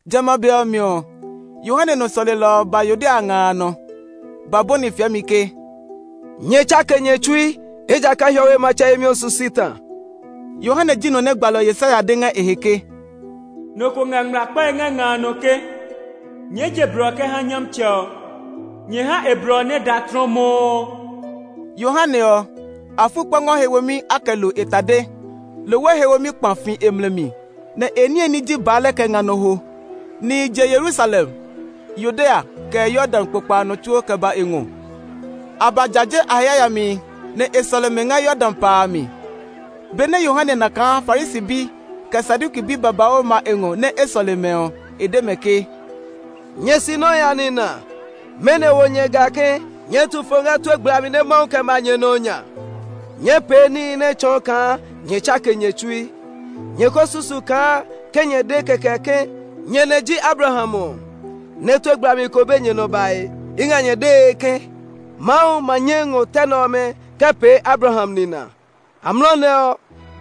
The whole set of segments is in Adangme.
Jamɛ a be ɔ mi ɔ, Yohane nɔ sɔlelɔ ɔ ba Yudea nga a nɔ, ba bɔni fiɛmi ke, “Nyɛ tsake nyɛ tsui, ejakaa hiɔwe matsɛ yemi ɔ su si ta.” Yohane ji nɔ nɛ gbalɔ Yesaya de ngɛ e he ke, “Nɔ ko ngɛ ngmlaa kpae ngɛ nga a nɔ ke, ‘Nyɛɛ je blɔ kɛ ha Nyɔmtsɛ ɔ; nyɛ ha e blɔ ɔ nɛ da tlɔmɔɔ.’” Yohane ɔ, afukpɔngɔ he womi a kɛ lo e tade; lohwe he womi kpa fi e mlɛ mi, nɛ e niye ní ji baalɛ kɛ nga nɔ hwo. Nihi je Yerusalem, Yudea, kɛ Yordan kpokpa a nɔ tsuo kɛ ba e ngɔ. A ba jaje a he yayamihi, nɛ e sɔle mɛ ngɛ Yordan pa a mi. Benɛ Yohane na kaa Farisi bi, kɛ Saduki bi babauu ma e ngɔ nɛ e sɔle mɛ ɔ, e de mɛ ke, “Nyɛ sinɔhi a nina, mɛnɔ wo nyɛ ga ke nyɛɛ tu fo ngɛ tue gblami nɛ Mawu kɛ ma nyɛ nɔ ɔ nya. Nyɛɛ pee níhi nɛ tsɔɔ kaa nyɛ tsake nyɛ tsui. Nyɛ ko susu kaa ke nyɛ de kɛkɛ ke nyɛ nɛ̃ ji Abraham ɔ, nɛ tue gblami ko be nyɛ nɔ bae. I ngɛ nyɛ dee ke, Mawu ma nyɛ ngɔ tɛ nɛ ɔmɛ kɛ pee Abraham nina! Amlɔ nɛ ɔ,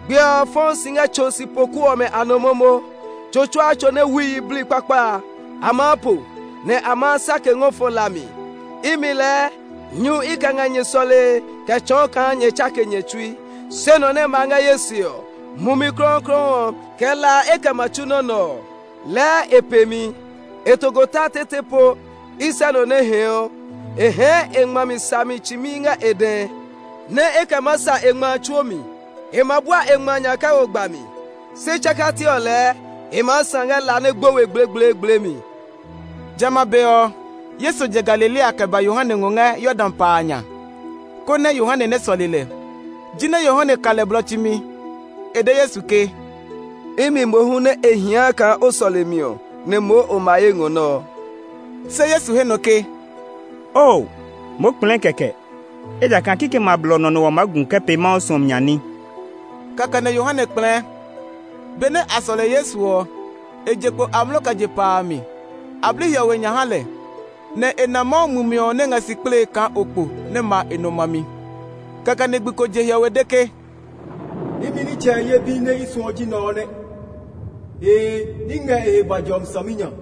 gbiɛ ɔ fɔɔ si ngɛ tso sipoku ɔmɛ a nɔ momo; tso tsuaa tso nɛ wui yiblii kpakpa a, a maa po, nɛ a ma sake ngɔ fɔ la mi. Imi lɛɛ nyu i kɛ ngɛ nyɛ sɔlee kɛ tsɔɔ kaa nyɛ tsake nyɛ tsui. Se nɔ nɛ ma ngɛ ye se ɔ, Mumi Klɔuklɔu ɔ, kɛ la e kɛ ma tsu nɔ nɛ ɔ. Lɛɛ e pe mi; e tokota tete po, i sɛ nɔ nɛ hɛɛɔ. E hɛɛ e ngma mi sami tsimi ngɛ e dɛ, nɛ e kɛ maa sa e ngma a tsuo mi. E ma bua e ngma a nya kɛ wo gba mi, se tsakati ɔ lɛɛ e maa sã ngɛ la nɛ gbo we gblegbleegble mi.” Jamɛ a be ɔ, Yesu je Galilea kɛ ba Yohane ngɔ ngɛ Yordan pa a nya, konɛ Yohane nɛ sɔle lɛ. Jinɛ Yohane ka lɛ blɔ tsimi; e de Yesu ke, “Imi mohu nɛ e hia kaa o sɔle mi ɔ, nɛ moo o ma ye ngɔ nɛ ɔ?” Se Yesu he nɔ ke, “Oo, moo kplɛɛ kɛkɛ, ejakaa kikɛmɛ a blɔ nɔ nɛ wa maa gu kɛ pee Mawu suɔmi nya ní.” Kɛkɛ nɛ Yohane kplɛɛ. Benɛ a sɔle Yesu ɔ, e je kpo amlɔ kɛ je pa a mi. A bli hiɔwe nya ha lɛ, nɛ e na Mawu Mumi ɔ nɛ ngɛ si kplee kaa okpo nɛ ma e nɔ mami. Kɛkɛ nɛ gbi ko je hiɔwe de ke, “Imi nitsɛ ye bi nɛ i suɔ ji nɛ ɔ nɛ! Ee, i ngɛ e he bua jɔmi saminya.”